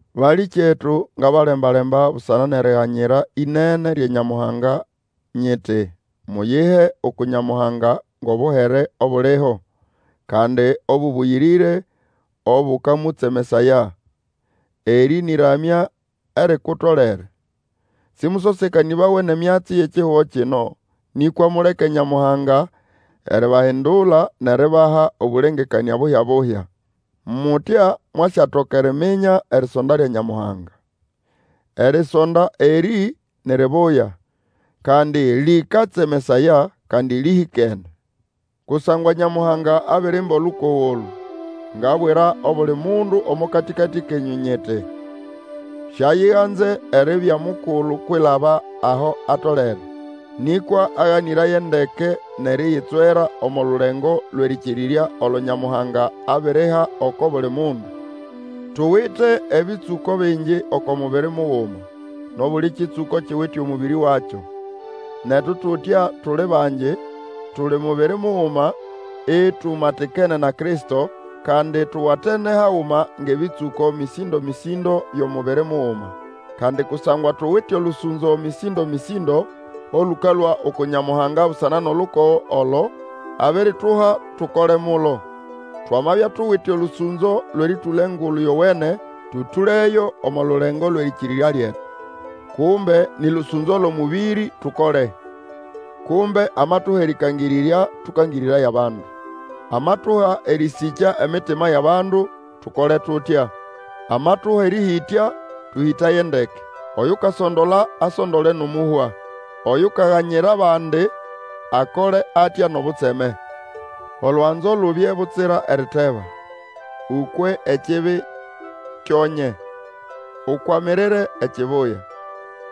Balĩkyetu, ngabalemba-lemba busana nʼeriganyira ĩnene lya Nyamuhanga, nyiti, muyihe uku Nyamuhanga ngʼobuhere obuliho, kandi obũbũyĩrĩre, obũkamũtsemesaya. Erĩ nĩ ʼramya erikutolere. Sĩmũsosekanĩbawe nʼemyatsi yʼekihugo kino, nĩkwa muleke Nyamuhanga eribahindula nʼeribaha obũlengekanĩa buhya-buhya. Mutya mwasyatoka eriminya erisonda lya Nyamuhanga. Erisonda erĩ ni ribuya, kandi lĩkatsemesaya, kandi lĩhĩkene. Kusangwa Nyamuhanga abirimba olukogo olũ, ngabwira obuli mundu omo katĩkatĩ kenyũ nyiti, siayiganze eribya mukulu kwilaba aho atolere, nĩkwa aganĩraye ndeke nʼeriyitswera omo lulengo lwʼerĩkĩrirya olo Nyamuhanga abiriha oko buli mundu. Tuwite ebĩtsũko bingi oko mubiri muguma, nʼobuli kĩtsũko kiwite omũbĩrĩ wakyo. Netu tutya tuli bangi, tuli mubiri muguma itumatikene na Kristo, kandi tuwatene haguma ngʼebĩtsũko mĩsĩndo-mĩsĩndo byʼomubiri muguma. Kandi kusangwa tuwite olũsũnzo mĩsĩndo-mĩsĩndo olũkalũa uku Nyamuhanga busana nʼolukogo olo abirituha tukole mulo. Twamabya tuwite olũsũnzo lwʼerĩtũla Engulu Yowene, tũtũleyo omo lulengo lwʼerĩkĩrĩrya lyetu. Kumbe nĩ lũsũnzo lwʼomũbĩrĩ, tukole. Kumbe amatuha erĩkangĩrĩrya, tũkangĩrĩraye abandu. Amatuha erĩsĩkya emitima yʼabandu, tukole tutya. Amatuha erĩhĩtya, tũhĩtaye ndeke. Oyukasondola asondole nʼomũhwa. Oyukaganyira abandi akole atya nʼobutseme. Olwanzo lubye butsira eriteba. Ũkwe ekibi kyo nye. Ukwamirire ekibuya.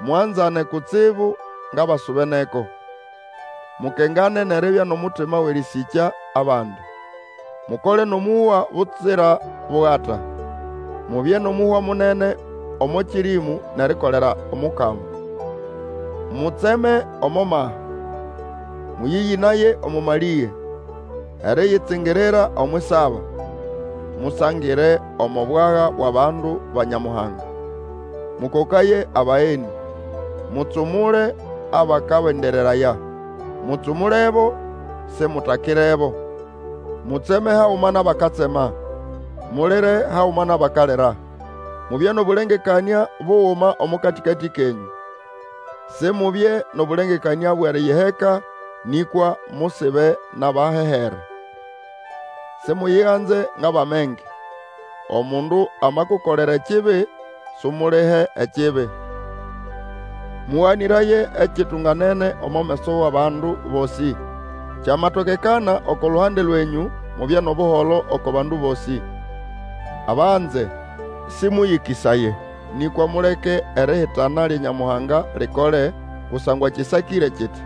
Mwanzane kutsibu ngʼabasubeneko. Mukengane nʼeribya nʼomutima wʼerĩsĩkya abandi. Mukole nʼomũhwa butsira bugata. Mubye nʼomũhwa munene omo kĩrĩmũ, nʼerikolera Omukama. Mutseme omo maha, mũyĩyĩnaye omo malĩge, eriyitsingirira omwʼisaba, musangire omo bwaga bwʼabandu ba Nyamuhanga, mũkokaye abagenĩ. Mutsumule abakabendereraya; mutsumulebo, simutakirebo. Mutseme haguma nʼabakatsema, mulire haguma nʼabakalira. Mubye nʼobũlengekanĩa buguma omo katĩkatĩ kenyũ; Simubye nʼobũlengekanĩa bwʼeriyiheka, nĩkwa musibe nʼabahehere. Simuyiganze ngʼabʼamenge. Omundu amakukolera ekibi, sumulihe ekibi. Mũganĩraye ekitunganene omo meso wʼabandu bosĩ. Kyamatokekana, oko luhande lwenyũ, mubye nʼobuholo oko bandu bosĩ. Abanze, sĩmũyĩkĩsaye, nĩkwa muleke erihitana lya Nyamuhanga likole, kusangwa kĩsakĩre kiti,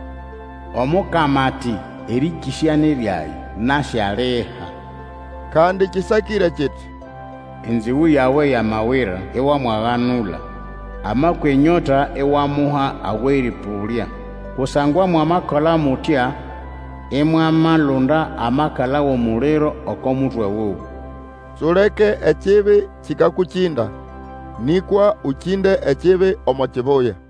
Omukama ati, Erĩkĩsya ni ryage. Nasyaliha. Kandi kĩsakĩre kiti, Enzĩgũ yawe yamawira, iwamwaganula, amakwa enyota, iwamuha awʼerĩpũlya; kusangwa mwamakola mutya imwamalunda amakala wʼomuliro oko mutwe wuwe. Suleke ekibi kĩkakũkĩnda, nĩkwa ũkĩnde ekibi omo kibuya.